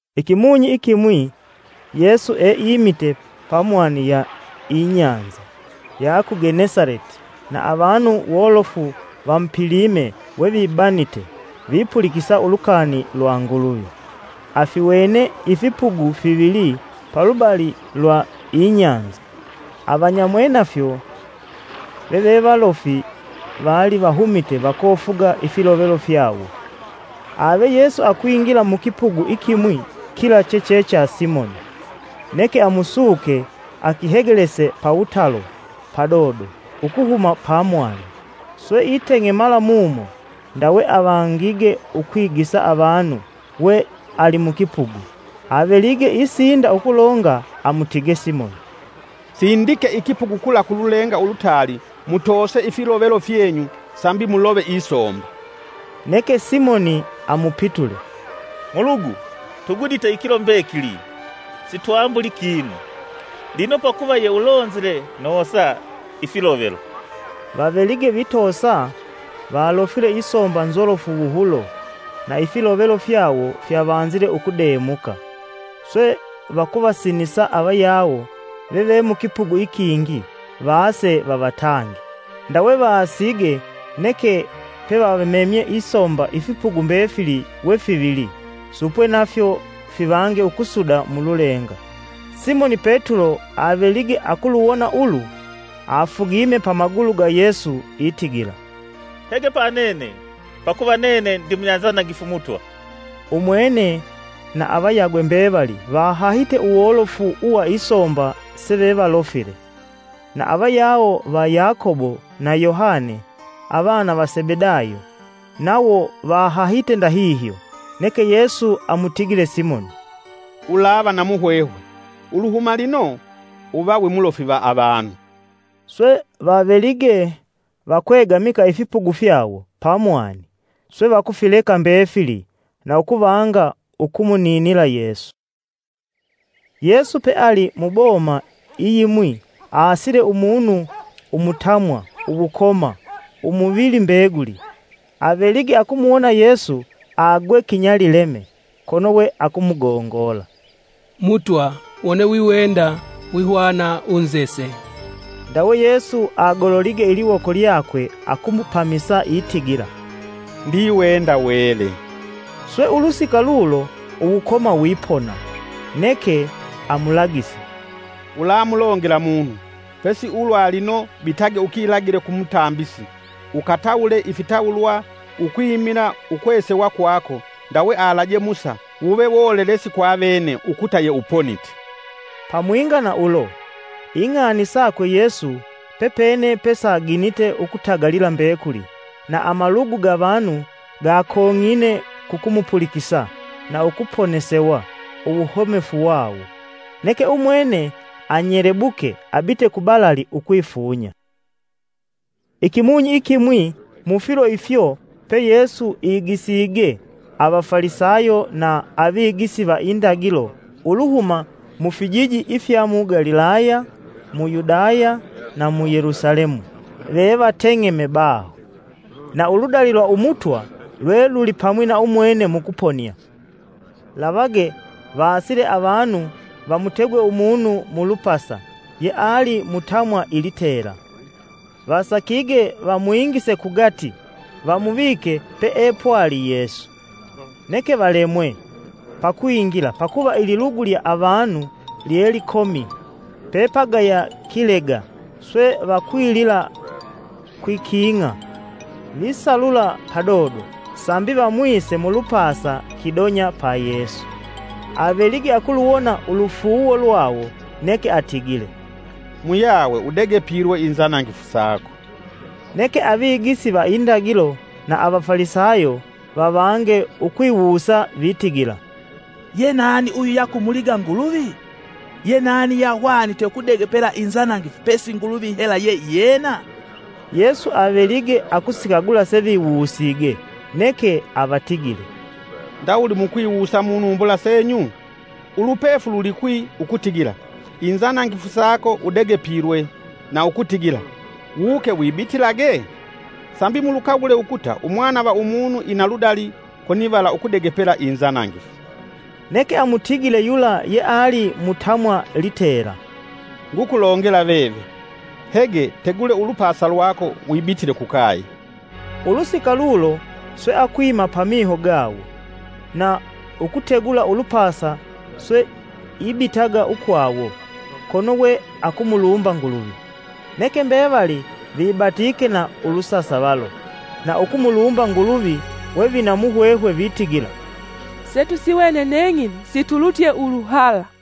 Ikimunyi ikimwi Yesu eimite pa mwani ya inyanza ya ku Genesaleti, na avanu wolofu vamupilime wevibanite, vipulikisa ulukani lwa Nguluvi. Afiwene ifipugu fivili palubali lwa inyanza, avanyamwenafyo vevevalofi vali vahumite vakofuga ifilovelo fyawo. Ave Yesu akwingila mukipugu ikimwi kila cheche cha Simoni, neke amusuke akihegelese pawutalo padodo ukuhuma panyanza. Swe iteng'emala mumo, ndawe avangige ukwigisa avanu we alimukipugu. Avelige isinda ukulonga amutige Simoni, “Sindike ikipugu kula kululenga ulutaali mutoose ifilovelo fyenyu sambi mulove isomba.” Neke Simoni amupitule, “Mulugu tugudite ikilo mbekili sitwambulii kinu, lino pakuva ye ulonzile noosa ifilovelo.” Vavelige vitoosa valofile isomba nzolofu wuhulo, na ifilovelo fyawo fyavanzile ukudemuka. Swe vakuvasinisa avayawo veve mukipugu ikingi vaase vavatange. Ndawe vaasige neke pevamemye isomba ifipugu mbefili wefivili, supwe nafyo fivange ukusuda mululenga. Simoni Petulo avelige akuluwona ulu, afugime pa magulu ga Yesu itigila, “Hege panene, pakuva nene ndi munyanzanangifu, Mutwa.” Umwene na avayagwe mbevali vahahite uwolofu uwa isomba sevevalofile. Na avayawo va Yakobo na Yohane avana va Sebedayo nawo vahahite ndahihyo. Neke Yesu amutigile Simoni, “Ulava na muhwehwe; uluhuma lino, uva wimulofi va avanu.” Swe vavelige vakwegamika ifipugu fyawo pamwani, swe vakufileka mbefili na ukuvanga ukumuninila Yesu. Yesu peali muboma iyimwi aasile umunu umutamwa uwukoma umuvili mbeguli; avelige akumuwona Yesu agwe kinyalileme, kono we akumugongola, “Mutwa wone wiwenda, wihwana unzese.” Ndawe Yesu agololige iliwoko lyakwe akumupamisa itigila “Ndiwenda wele.” Swe ulusika lulo uwukoma wipona. Neke amulagise, “Ulamulongela munu, pesi ulwa lino bitage ukilagile kulumutambisi, ukatawule ifitawulwa ukwimila ukwesewa kwako ndawe alaje Musa wuve wolelesi kwavene ukuta yeuponite.” Pamwinga na ulo, ing'ani sakwe Yesu pepene pesaginite ukutagalila mbekuli, na amalugu ga vanu gakong'ine kukumupulikisa na ukuponesewa uwuhomefu wawo. Neke umwene anyelebuke abite kubalali ukwifunya. Ikimunyi ikimwi mufilo ifyo pe Yesu igisige, avafalisayo na avigisi va indagilo uluhuma mufijiji ifya mu Galilaya mu Yudaya na mu Yelusalemu vevateng'eme baho. Na uludali lwa Umutwa lwe lulipamwi na umwene mukuponia. Lavage, vaasile avanu vamutegwe umunu mulupasa yeali mutamwa ilitela. Vasakige vamwingise kugati vamuvike peepwali Yesu. Neke valemwe pakwingila, pakuva ililugu lya avanu lye likomi pepagaya kilega, swe vakwilila kwiking'a visalula padodo sambi vamwise mulupasa kidonya pa Yesu. Avelige akuluwona ulufuuwo lwawo, neke atigile, “Muyawe udegepilwe inzanangifu sako.” Neke avigisi va indagilo na avafalisayo vavange ukwiwusa vitigila, “Ye nani uyu yakumuliga Nguluvi? Ye nani yeahwanite ukudegepela inzanangifu pe si Nguluvi hela ye iyena?” Yesu avelige akusikagula seviwusige, neke avatigile, “Ndawuli mukwiwusa munumbula senyu? Ulupefu lulikwi ukutigila, ‘Inzanangifu sako udegepilwe’, na ukutigila, ‘Wuke wibitilage?’ Sambi mulukagule ukuta Umwana va Umunu ina ludali konivala ukudegepela inzanangifu.” Neke amutigile yula yeali mutamwa litela, “Ngukulongela veve, hege tegule ulupasa lwako wibitile kukaye.” Ulusika lulo swe akwima pamiho gawo, na ukutegula ulupasa swe ibitaga ukwawo, kono we akumulumba Nguluvi. Neke mbevali vibatike na ulusasavalo na ukumulumba Nguluvi, we vina muhwehwe vitigila, “Setusiwene neng'ino situlutye uluhala!”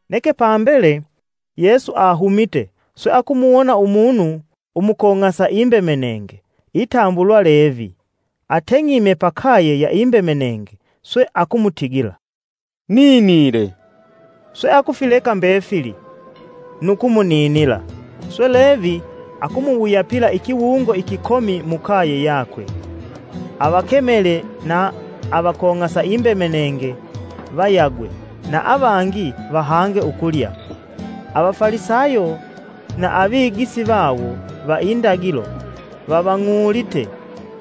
Neke pambele, Yesu ahumite swe akumuwona Umunu umukong'asa imbemenenge itambulwa Levi ateng'ime pakaye ya imbemenenge, swe akumutigila, “Ninile!” Swe akufileka mbefili, nu kumuninila. Swe Levi akumuwuyapila ikiwungo ikikomi mukaye yakwe. Avakemele na avakong'asa imbemenenge vayagwe na avangi vahange ukulya. Avafalisayo na avigisi vawo va indagilo, vavang'ulite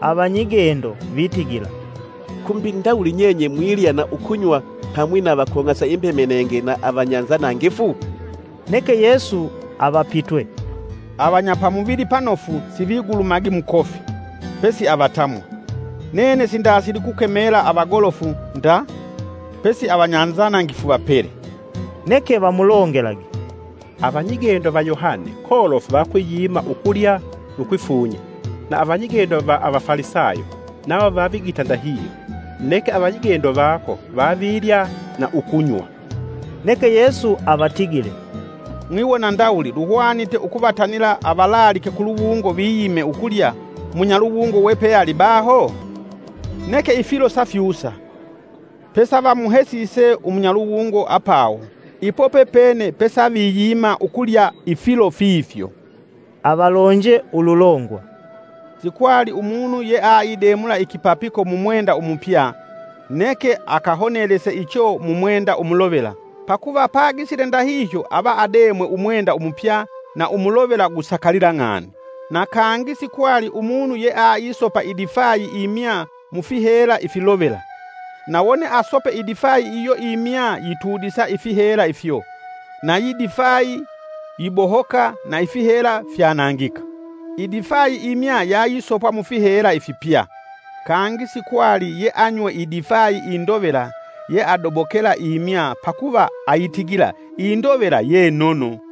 avanyigendo vitigila: “Kumbi ndawuli nyenye mwilya na ukunywa pamwi na avakong'asa imbemenenge na avanyanzanangifu?” Neke Yesu avapitwe, “Avanya pa muvili panofu sivigulumagi mukofi, pesi avatamwa. Nene sindasili kukemela avagolofu nda, pesi avanyanzanangifu vapele.” Neke vamulongelage, “Avanyigendo va Yohane kolofu vayikwiyima ukulya nu kwifunya, na avanyigendo va avafalisayo nawo vavigita ndahihyo, neke avanyigendo vako vavilya na ukunywa.” Neke Yesu avatigile, “Mwiwona ndawuli luhwanite ukuvatanila avalaalike kuluwungo viyime ukulya munyaluwungo we pealibaho? Neke ifilo safyusa, pesa vamuhesise umunyaluwungo apawo ipo pepene pesaviyima ukulya ifilo fifyo.” Avalonje ululongwa, “Sikwali umunu yeaidemula ikipapiko mu mwenda umupya; neke akahonelese icho mwenda umulovela pakuva pagisile ndahihyo ava ademwe umwenda umupya na umulovela gusakalila ng'ani. Na kangi sikwali umunu yeaisopa idifayi imya mufihela ifilovela; na wone asope idifayi iyo imya yitudisa ifihela ifyo, nayi difayi yibohoka na ifihela fyanangika. Idifayi imya yayisopwa mufihela ifipya. Kangi sikwali yeanywe idifayi indovela yeadobokela imya pakuva aitigila indovela ye nono.”